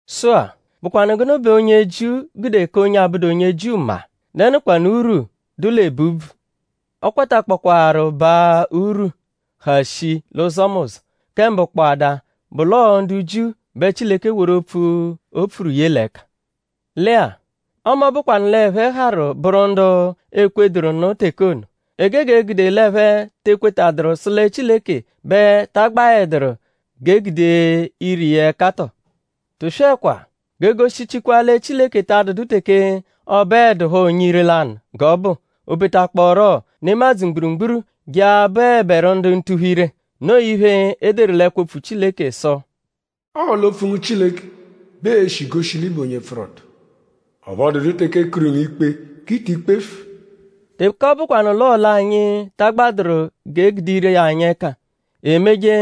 Sụ-a;?bụkwanu gụnu bẹ onye Jiu gude ka onye abụdu onye Jiu mma??Dẹnukwanu urwu, dụ l'ebu úbvù? Ọ kwatakpọkwaaru baa urwu, ha shii l'ụzomuzo. Kẹ mbụ kpọada bụ l'ọo ndu Jiu bẹ Chileke woru opfu, o pfuru ye l'ẹka. Lẹ-a; ọme ọ bụkwanu l'ẹphe harụ bụru ndu ekwetadụru nụ teke ono;?e gege gude l'ẹphe te ekwetadụru sụ lẹ Chileke bẹ ta agbaẹduru g'e gude ire iya ẹka tọo? Tụswekwa! G'e goshichikwa lẹ Chileke ta adụdu teke ọ bụedupho onye ire-lanụ g'ọ bụ; o betakpọoru nemadzụ mgburugburu je a-bụeberu ndu ntuphu-ire. Noo iphe, e deru l'ẹkwo-opfu Chileke sụ: “Ọo l'opfu ngu Chileke bẹ ee-shi goshi l'ị bụ onye pfụru ọto. Ọphu ọ dụdu teke e kuru ngu ikpe g'i ti kpefu.” Teke ọ bụkwanu l'ọo l'anyi ta agbadụru g'e gude ire anyi ẹka emeje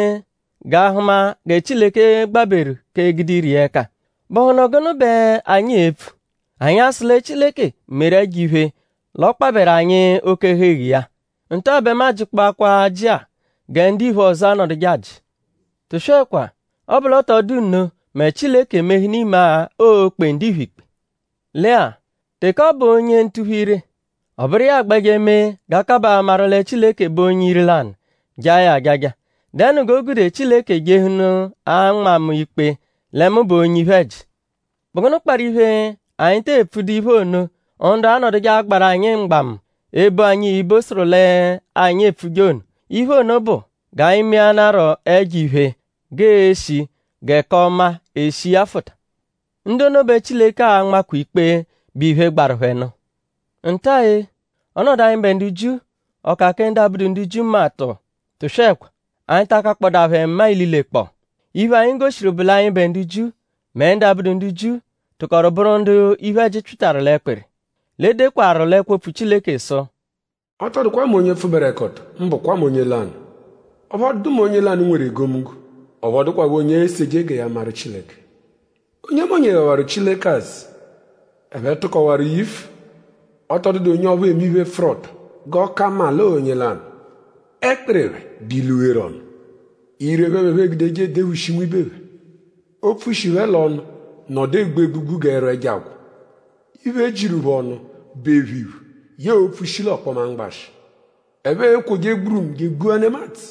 g'a hụma gẹ Chileke gbaberu k'egude ire iya ẹka;?bụhunu gụnu bẹ anyi e-pfu??Anyi a-sụ lẹ Chileke meru ẹjo-iphe l'ọ kpabẹru anyi oke-ẹhu-eghu iya? Nta bẹ mu ajịkpoakwa ajị-a gẹ ndiphe ọzo anọduje ajị. Tụswekwa! Ọ -bụ l'ọ tọ dụ nno mẹ?Chileke emehụnu imagha oo-kpe ndiphe ikpe? Lẹ-a; teke ọ bụ onye ntuphu-ire; ọ bụru iya agbẹje mee g'a kabaa amaru lẹ Chileke bụ onye ire-lanụ; jaa ya ajaja;?dẹnu g'o gude Chileke jehụnu a-nma mu ikpe lẹ mu bụ onye iphe-ẹji? ?Bụ gụnu kparụ iphe, anyi tee pfudu iphe ono, ndu anọduje agbaru anyi mgbamu; ebo anyi ibo sụru l'anyi epfuje ono? Iphe ono bụ: “G'anyi meanarọ ẹjo-iphe g'ee-shi gẹ k'ọma eshi iya fụta.” Ndu ono bẹ Chileke a-nmakwa ikpe, bụ iphe, gbaru phẹ nụ. ?Nta-a-ee? Ọnodu anyịbe ndu Jiu?ọ ka kẹ ndu abụdu ndu Jiu mma tọ? Tụswekwa! Anyi ta akakpọdaa phẹ mma ililekpọo. Iphe, anyi goshiru bụ l'anyịbe ndu Jiu; mẹ ndu abụdu ndu Jiu tụkoru bụru ndu iphe-ẹji pyịtaru l'ẹkpiri. L'e dekwaru l'ẹkwo opfu Chileke sụ: “Ọ tọ dụkwa mẹ onye pfụberekoto; mbụkwa m'onye lanụ. Ọphu ọ dụdu mẹ onye lanụ, nweru egomunggo; ọphu ọ dụkwapho onye eseje gẹ ya maru Chileke. Onyemonye ghawarụ Chileke azụ. Ẹphe tụkowaru yifu. Ọ tọ dụdu onye ọphu eme iphe, pfụru-ọto g'ọ ka mma l'ọo onye lanụ. Ẹkpiri phẹ bụ ilu, gheru ọnu. Ire phẹ bẹ ẹphe egudeje edephushi nwibe phẹ. Opfu, shi phẹ l'ọnu nọdu egbu egbugbu g'ẹru ẹjo agwọ. Iphe, jiru phẹ ọnu bụ ephu iphu yẹe opfu, shi l'ọkpoma mgbashị. Ẹphe ekwoje gburumu je egbua nemadzụ.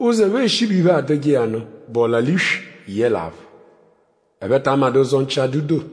Ụzo, ẹphe eshi bụ iphe, adụje iya nụ bụ ọla-l'iswi yẹle aphụ. Ẹphe ta amadụ ụzo nchi adụ-doo.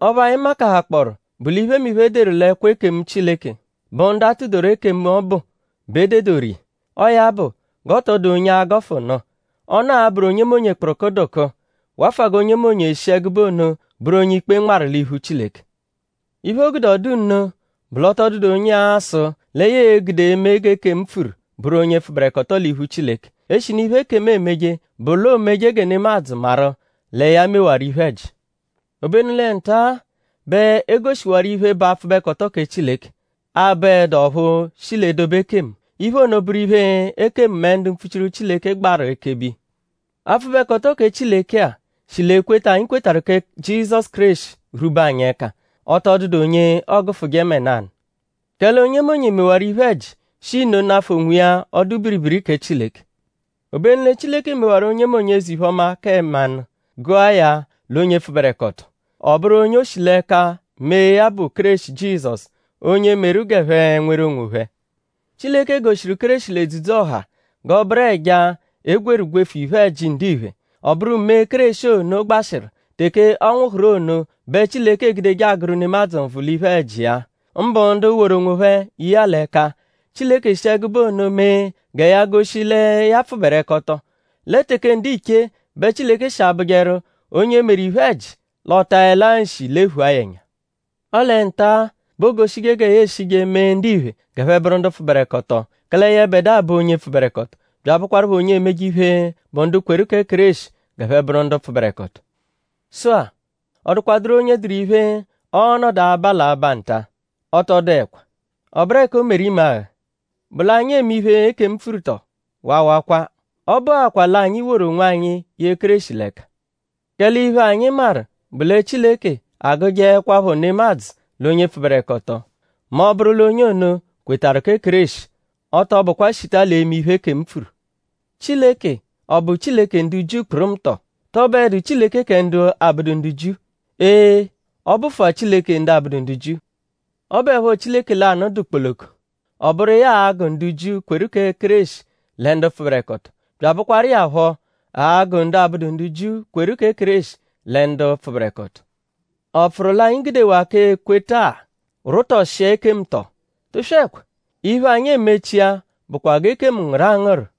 Ọphu anyi makahakpọoru bụ l'iphemiphe, e deru l'ẹkwo ekemu Chileke bụ ndu a tụ-doru ekemu ọbu bẹ e dedoru iya. Ọo ya bụ g'ọ tọ dụ onye a-gọfu nụ. Ọnu abụru onyemonye kpụrukudukuu; wafụa g'onyemonye e-shi ẹgube ono bụru onye-ikpe nmarụ l'iphu Chileke. Iphe, o gude ọ dụ nno bụ l'ọ tọ dụdu onye a-sụ lẹ ya e-gude eme g'ekemu pfuru bụru onye pfụberekoto l'iphu Chileke; eshinu iphe, ekemu emeje bụ l'o meje gẹ nemadzụ maru lẹ ya mewaru iphe-ẹji. Obenu lẹ nta-a bẹ e goshiwaru iphe, bụ apfụbekoto kẹ Chileke, abụedu ọphu shi l'edobe ekemu. Iphe ono bụru iphe, ekemu mẹ ndu mpfuchiru Chileke gbarụ ekebe iya. Apfụbekoto kẹ Chileke-a; shi l'ekweta anyi kwetarụ kẹ Jizọsu Kéreshi rwube anyi ẹka. Ọ tọ dụdu onye ọogufuje mẹ nanụ; kẹle onyemonye mewaru iphe-ẹji; shi nno nafụ onwiya ọdu-biribiri kẹ Chileke. Obenu lẹ Chileke mewaru onyemonye eze-iphe-ọma kẹ mmanụ gụa ya l'onye pfụberekoto. Ọ bụru onye o shi l'ẹka mee ya bụ Kéreshi Jizọsu onye meru g'ẹphe nweru onwophẹ. Chileke goshiru Kéreshi l'edzudzu-ọha g'ọ bụru ẹja, e gwerụ gwefu iphe-ẹji ndiphe. Ọ bụru mee, Kéreshi ono gbashịru teke ọ nwụhuru ono bẹ Chileke egudeje agụru nemadzụ nvụ l'iphe-ẹji iya; mbụ ndu woru onwophẹ ye iya l'ẹka. Chileke shi ẹgube ono mee gẹ ya goshi lẹ ya pfụberekoto. Lẹ teke ndiche bẹ Chileke shi abụjeru onye meru iphe-ẹji l'ọ taẹlaa nshi lephua ya ẹnya. Ọle nta-a bẹ oogoshije gẹ ya eshije mee ndiphe g'ẹphe bụru ndu pfụberekoto; kẹle yẹbedua bụ onye pfụberekoto bya abụkwarupho onye emeje iphe, bụ ndu kwetarụ kẹ Kéreshi g'ẹphe bụru ndu pfụberekoto. Sụ-a;?ọ dụkwaduru onye dụru iphe, ọo-nọdu aba l'aba nta? Ọ tọ dụekwa.?Ọ bụru ẹka o meru imagha??Bụ l'anyi eme iphe, ekemu pfuru tọo? Waawakwa. Ọ bụakwaa l'anyi woru onwanyi ye Kéreshi l'ẹka. Kẹle iphe, anyi maru bụ lẹ Chileke agụjeekwapho nemadzụ l'onye pfụberekoto mẹ ọ -bụru l'onye ono kwetarụ kẹ Kéreshi; ọ tọ bụkwa shita l'eme iphe, ekemu pfuru. Chileke?ọ bụ Chileke ndu Jiu kpụrumu tọ??Tọ bụedu Chileke kẹ ndu abụdu ndu Jiu? Ee! Ọ bụfua Chileke ndu abụdu ndu Jiu. Ọ bụepho Chileke lanụ dụ kpoloko. Ọ bụru iya a-gụ ndu Jiu, kweru kẹ Kéreshi lẹ ndu pfụberekoto; bya abụkwaru iya phọ a-gụ ndu abụdu ndu Jiu, kweru kẹ Kéreshi lẹ ndu pfụberekoto. ?Ọ pfụru l'anyi gudewaa k'ekweta-a rwụtoshia ekemu tọo? Tụswekwa! Iphe, anyi emechia bụkwa g'ekemu ngụru angụru.